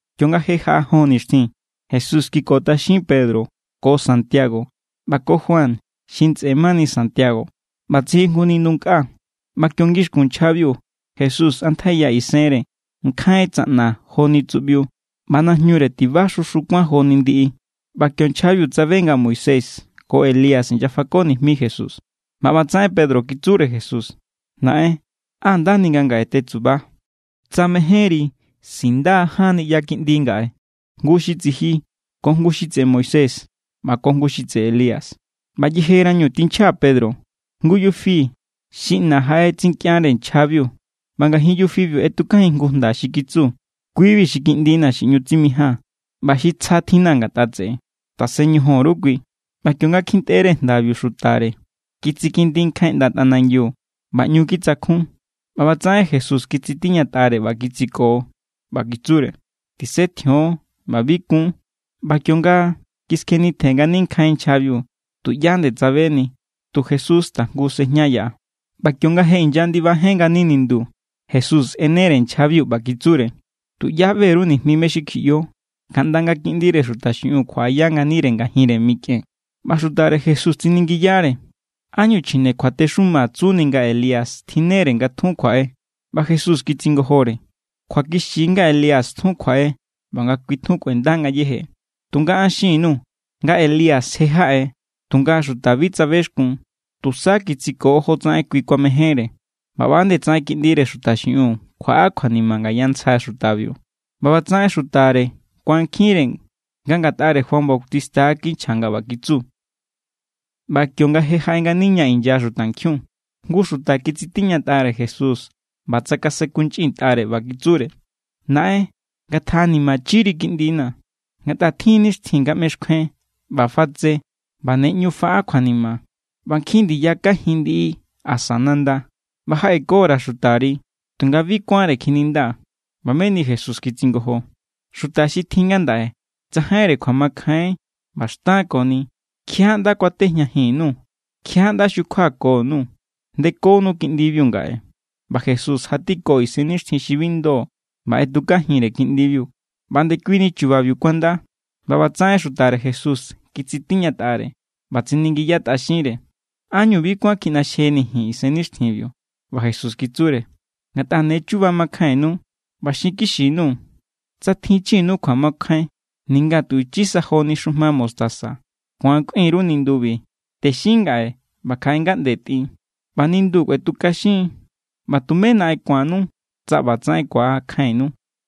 Kionga je jaꞌa jon nixtjin, Jesús kikotꞌaxin Pedro ko Santiago ꞌba ko Juan xi ntsꞌe mani Santiago ꞌba tsijin jngu nindu nkꞌa. ꞌBa kio ngixkun nchjabiu, Jesús tsꞌantjaiya isenre. Nkjain tsaꞌna joni tsuꞌbiu, ꞌba najñure tiba xu xu kuán joni ndiꞌi. ꞌBa kio nchjabiu tsabe nga Moisés ko Elías inyafako nijmi Jesús. ꞌBa ꞌbatsaꞌen Pedro kitsure Jesús: —Naꞌen, ¡á ndani nga ngaꞌe tetsuba! Tsa mejénri, sindaa̱ ján niꞌya kiꞌndi ngaꞌe, jngu xi tsiji ko jngu xi tseꞌe Moisés ꞌba ko jngu xi tseꞌe Elías. ꞌBa yejerañu tinchja Pedro, jngu yufi xi ꞌna jaꞌetsinkꞌianre nchjabiu, ꞌba ngajin yufibiu ꞌetjujin jngu jnda xi kitsu: —Kui=bi xi Kiꞌndina̱ xi ꞌñu tsimijaa̱n ꞌba xi tsja tjinna̱ ngatꞌa tseꞌe. Tasen ñojon_ru kui. ꞌBa kionga kjintꞌere jndabiu xutare, kitsikindi nkjain ꞌnda tꞌanangiu ꞌba ꞌñu kitsakjun. ꞌBa ꞌbatsaꞌen Jesús kitsitiñatꞌare ꞌba kitsiko, ꞌba kitsure: —Tisetjion ꞌba bi kun. ꞌBa kionga kiskjenitjen ngani nkjain nchjabiu, tuꞌyá nde tsabeni. Tu Jesús tajngu sejña yaꞌa. ꞌBa kionga je inyandibajen ngani nindu, Jesús ꞌenere nchjabiu, ꞌba kitsure: —Tuꞌyá ꞌbe_ru nijmi mé= xi kjiꞌyo, kaꞌnda nga Kiꞌndire Xuta xiꞌiun kjuaꞌaya nganire ngajinre mikꞌen. ꞌBa xutare Jesús tsiningiyare: —¿Ánñu chjine kjuatexuma tsuni nga Elías tjinnere nga tjun kjuaꞌe? ꞌBa Jesús kitsingojore: —Kjuakixi= nga Elías tjun kjuaꞌe ꞌba nga kui kꞌuenda ngayéje. Tunga an xin_nuu̱ nga Elías je jaꞌe, tunga xuta bi tsabexkun, tusa kitsiko jotsaꞌen kui kuamejénre. ꞌBa ꞌba=nde tsaꞌen Kiꞌndire Xuta xiꞌiun kjuaꞌa kjuanima ngaya ntsja xutabiu. ꞌBa ꞌbatsaꞌen xutare kuankjinre nga ngatꞌare Juan Bautista= kinchja nga ꞌba kitsu. ꞌBa kionga jaꞌe ngani ña inya xutankjiun, jngu xuta kitsitiñatꞌare Jesús ꞌba tsakasenkunchꞌintꞌare, ꞌba kitsure: —Naꞌen, ngatjaꞌanimachiri kiꞌndina̱, ngatꞌa tjin= nixtjin nga ꞌmexkjuen ꞌba fatse ꞌba ne ꞌñu faꞌa kjuanima. ꞌBa nkjin ndiya kajin ndiꞌi asa nanda. ꞌBa jaꞌeko_ra̱ xutari, tunga bi kuánre kjininda. ꞌBa meni Jesús kitsingojo: —¡Xuta xi tjin ngandaꞌe tsajainre kjuamakjain ꞌba xtan koni! ¿Kjiaꞌá= ꞌnda kuatejñajin_nuu̱? ¿Kjiaꞌá= ꞌnda xukjuako_nuu̱? Ndekonu kiꞌndibiu ngaꞌe. ꞌBa Jesús jatiko isennixtjin xi bi ndo, ꞌba ꞌetjukajinre kiꞌndibiu. ꞌBa ndekuini chubabiu kuanda. ꞌBa ꞌbatsaꞌen xutare Jesús kitsitiñatꞌare ꞌba tsiningiyatꞌaxinre: —¿Ánñu bi kuán kjiꞌnaxjeni̱ ji̱n isennixtjinbiu? ꞌBa Jesús kitsure: —Ngatꞌa ne chuba makjainnu, ꞌba xinkixi_nuu̱, tsa tjinchinu kjuamakjain ninga tu ichisa joni xujma mostaza, ku̱an kꞌuin_ru nindubi: “Texin ngaꞌe ꞌba kjaꞌe ngaꞌnde tꞌin”, ꞌba nindu kuetukaxin. ꞌBa tume naꞌen ku̱annu tsa ꞌba tsaꞌen ku̱akjainnu.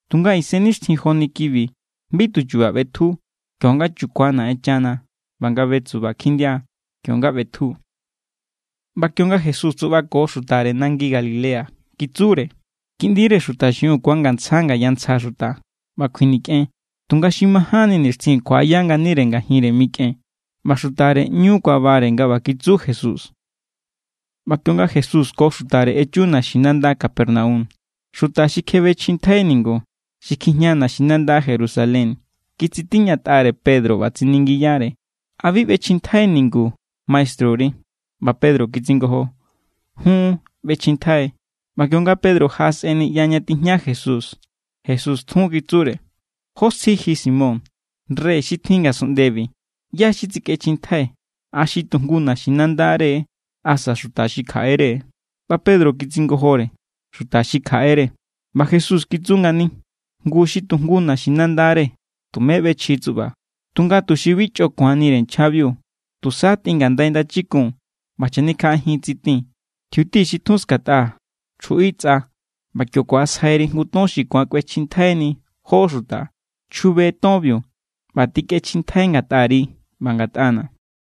Tunga isennixtjin joni kibi bi tu chu̱ba̱ ꞌbetju. Kio=nga chukua Naꞌenchana ꞌba nga betsuba kjindia, kio=nga ꞌbetju. ꞌBa kionga Jesús tsuꞌbako xutare nangi Galilea, kitsure: —Kiꞌndire Xuta xiꞌiun ku̱angantsja ngaya ntsja xuta, ꞌba kjuinikꞌen. Tunga xi majánni nixtjin kjuaꞌaya nganire ngajinre mikꞌen. ꞌBa xutare ꞌñu kuabare nga ꞌba kitsu Jesús. ꞌBa kionga Jesús ko xutare echu naxinanda Capernaum, xuta xi kjebechjintjai ningu xi kjijña naxinanda Jerusalén kitsitiñatꞌare Pedro, ꞌba tsiningiyare: —¿A bi ꞌbechjintjai ningu maestruri? ꞌBa Pedro kitsingojo: —Jun, ꞌbechjintjai. ꞌBa kionga Pedro jaꞌasꞌen niꞌya ña tijña Jesús, Jesús tjun kitsure: —¿Jó sji ji, Simón? Rey xi tjin ngasunꞌndebi, ¿ꞌyá= xi tsikꞌechjintjai? ¿A xi tujngu naxinandare, asa xuta xi kjaꞌere? ꞌBa Pedro kitsingojore: —Xuta xi kjaꞌere. ꞌBa Jesús kitsu ngani: —Ngu, xi tujngu naxinandare tume ꞌbechji, tsuꞌba. Tunga tuxi bi chꞌo ku̱anire nchjabiu, tusa tꞌin ngandai ndachikun ꞌba chanikjaꞌajin tsitin. Tjiuti xi tjun skatꞌa, chjuꞌi tsꞌa. ꞌBa kio ku̱asjairi jngu ton xi ku̱an kꞌuechjintjaini jó xuta. Chjube tonbiu ꞌba tꞌikꞌechjintjai ngatꞌari ꞌba ngatꞌana̱.